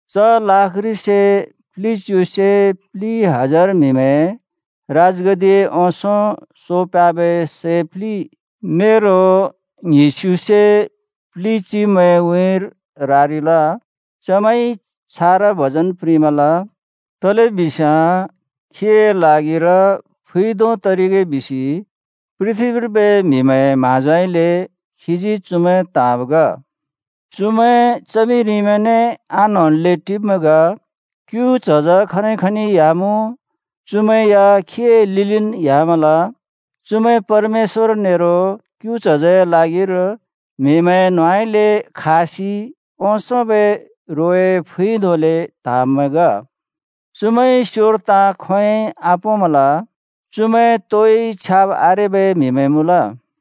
च लाख घ्रि से प्लिच्यु से प्लि हजार म्‍हिमैं राजगद्दिए ओंसों सो प्ह्‍याबै सै प्लि, नेरो ङ्हिस्युसे प्लि चिब्मैंए उँइँर रारिल। चमैंइ छारा भजन प्रिंमल, तलेबिस्याँ खीए ल्हागिर फुइ धों तरिगे बिसि पृथ्‍बीर्बै म्हिमैंए म्हाँजोउँइँले खीजी चुमैं त्हाँब् ग। चुमैं च्हमिरिमैंने आन्‍होंल्‍ले टिब्‍मैं ग। क्‍यु च्हज खनि खनि ह्‍यामुँ, चुमैं या खीए लिलिन् ह्‍यामल। चुमैं परमेश्‍वर नेरो क्‍यु च्हजए ल्हागिर म्हिमैंए न्होंउँइँले खासि ओंसोंबै रोए फुइ धोंले त्हाँब्मैं ग। चुमैंइ स्‍योर ताँ खोंयोंइ आपोंमल, चुमैं तोइ छ्याब् आरेबै म्‍हिमैं मुँल।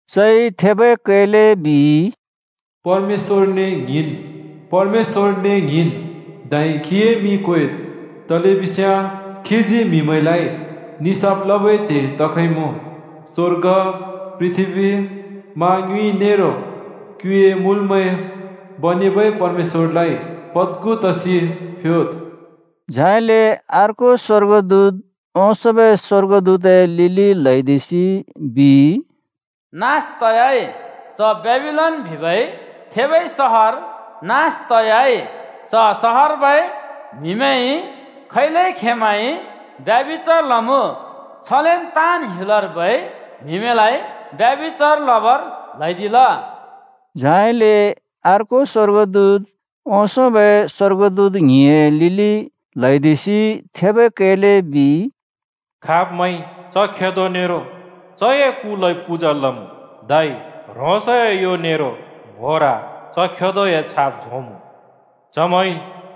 चइ थेबै कैले बिइ, “परमेश्‍वरने ङ्हिंन्, धै खीए मिं क्वेद्। तलेबिस्याँ खीजी म्‍हिमैंलाइ निसाफ लबै त्हे तखइमुँ। स्वर्ग, पृथ्‍बी, मा ङ्युँइ नेरो क्‍युए मुल्मैं बनेबै परमेश्‍वरलाइ पद्खु तसि फ्‍योद्।” झाइले अर्को स्‍वर्गदूत ओंसोंबै स्‍वर्गदूतए लिलि ल्‍हैदिसि बिइ, “नास तयाइ! च बेबिलोन बिबै थेबै सहर नास तयाइ। च सहरर्बै म्‍हिमैंइ खैले खेंमैंइ ब्यभिचार लमुँ छलेन ताँन् ह्‍युलर्बै म्हिमैंलाइ ब्यभिचार लबर ल्हैदिल।” झाइले अर्को स्‍वर्गदूत ओंसोंबै स्‍वर्गदूत ङ्हिंए लिलि ल्‍हौदिसि थेबै कैले बिइ, “खाब‍मैंइ च खेदो नेरो चए कुलाइ पूजा लमुँ, धै ह्रोंसए यो नेरो ङ्‌होर च खेदोए छाप झोंमुँ, चमैंइ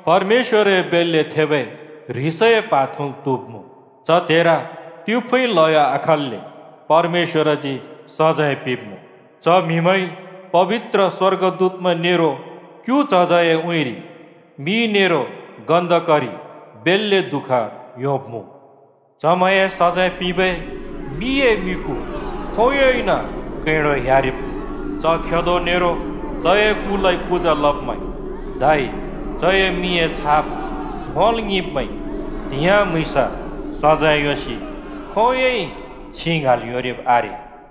परमेश्‍वरए बेल्‍ले थेबै ह्रिसए प्हा थुँल् त्‍हुब्‍मुँ। च त्हेर तिफुँइ ल्हयो आखल्‍ले परमेश्‍वरजी सजैं पिंब्‍मुँ। च म्‍हिमैंइ पबित्र स्‍वर्गदूतमैं नेरो क्‍यु च्हजए उँइँरि मि नेरो गन्‍धकरि बेल्‍ले दुःख योंब्‍मुँ। चमैंए सजैं पिंबै मिए मिखु खोंयोंइन कैंडो ह्‍यारिब्‍मुँ। च खेदो नेरो चए कुलाइ पूजा लब्मैं, धै चए मिंए छाप झोंल् ङिंब्मैंइ त्‍हिंयाँ म्‍हुँइँस सजैं योंसि खोंयोंइ छिं ङ्हाँल् योंरिब् आरे।”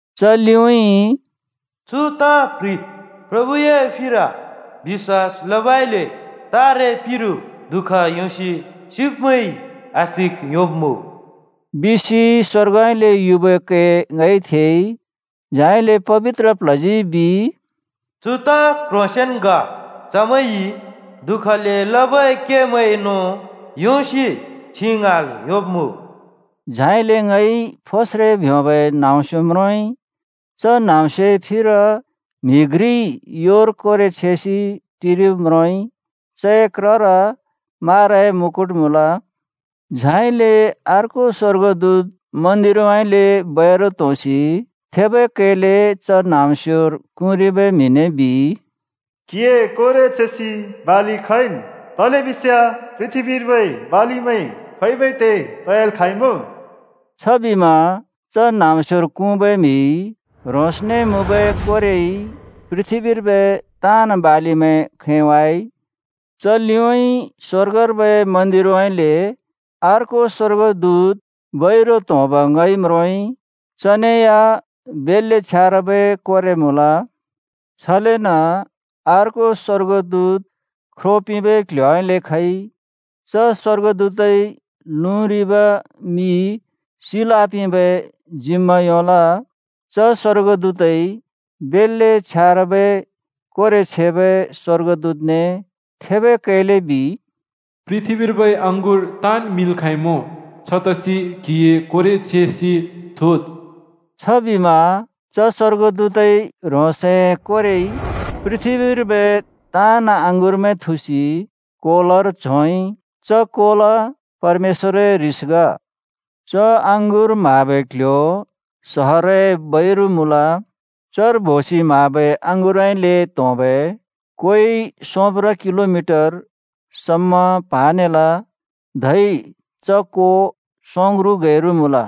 च लिउँइँ “चु ताँ प्‍ह्रिद्: प्रभुए फिर बिश्‍वास लबइले तारे पिरु दु:ख योंसि सिब्‍मैंइ आशिक योंब्मुँ,” बिसि स्‍वर्गउँइँले युबै कै ङइ थेइ। झाइले पबित्र प्ल्हजी बिइ, “चु ताँ क्‍ह्रोंसेंन् ग। चमैंइ दु:खले लबै केमैंए नों योंसि छिं ङ्हाँल् योंब्‍मुँ।” झाइले ङइ फोस्रे ब्योंबै न्‍हाँम्‍स्यो म्रोंइ। च न्‍हाँम्‍स्योए फिर म्‍हि घ्रिइ योर कोरे छेसि टिरिब् म्रोंइ। चए क्रर माराए मुकुट मुँल। झाइले अर्को स्‍वर्गदूत मन्‍दिरउँइँले बैरु त्‍होंसि थेबै कैले च न्हाँम्स्योर क्हुँरिबै म्हिने बिइ, “क्‍हिए कोरे छेसि बालि खैंन्, तलेबिस्याँ पृथ्‍बीर्बै बालिमैं खैंबै त्हे तयाल् खाँइमुँ।” छबिमा च न्‍हाँम्‍स्योर क्हुँबै म्‍हिइ ह्रोंसने मुँबै कोरेइ पृथ्‍बीर्बै ताँन् बालिमैं खैंवाइ। च लिउँइँ स्‍वर्गर्बै मन्‍दिरउँइँले अर्को स्‍वर्गदूत बैरु त्‍होंब् ङइ म्रोंइ। चने या बेल्‍ले छ्यारबै कोरे मुँल। छलेन अर्को स्‍वर्गदूत ख्रो पिंबै क्ल्ह्‍योउँइँले खइ। च स्‍वर्गदूतइ लुँरिबै मि सिल् आपिंबै जिम्‍मा योंल। च स्‍वर्गदूतइ बेल्‍ले छ्यारबै कोरे छेबै स्‍वर्गदूतने थेबै कैले बिइ, “पृथ्‍बीर्बै अँगुर ताँन् मिंल् खाँइमुँ। छतसि क्हिए कोरे छेसि थुद्।” छबिमा च स्‍वर्गदूतइ ह्रोंसए कोरेइ पृथ्‍बीर्बै ताँन् अँगुरमैं थुसि कोलर झोंइ। च कोल परमेश्‍वरए ह्रिस ग। च अँगुर म्हाबै क्ल्ह्‍यो सहरए बैरु मुँल। चर बोसि म्हाबै अँगुरउँइँले त्होंबै कोइ सोंप्र किलो मिटर समा प्हानेल धै च को सोंग्रु गैरु मुँल।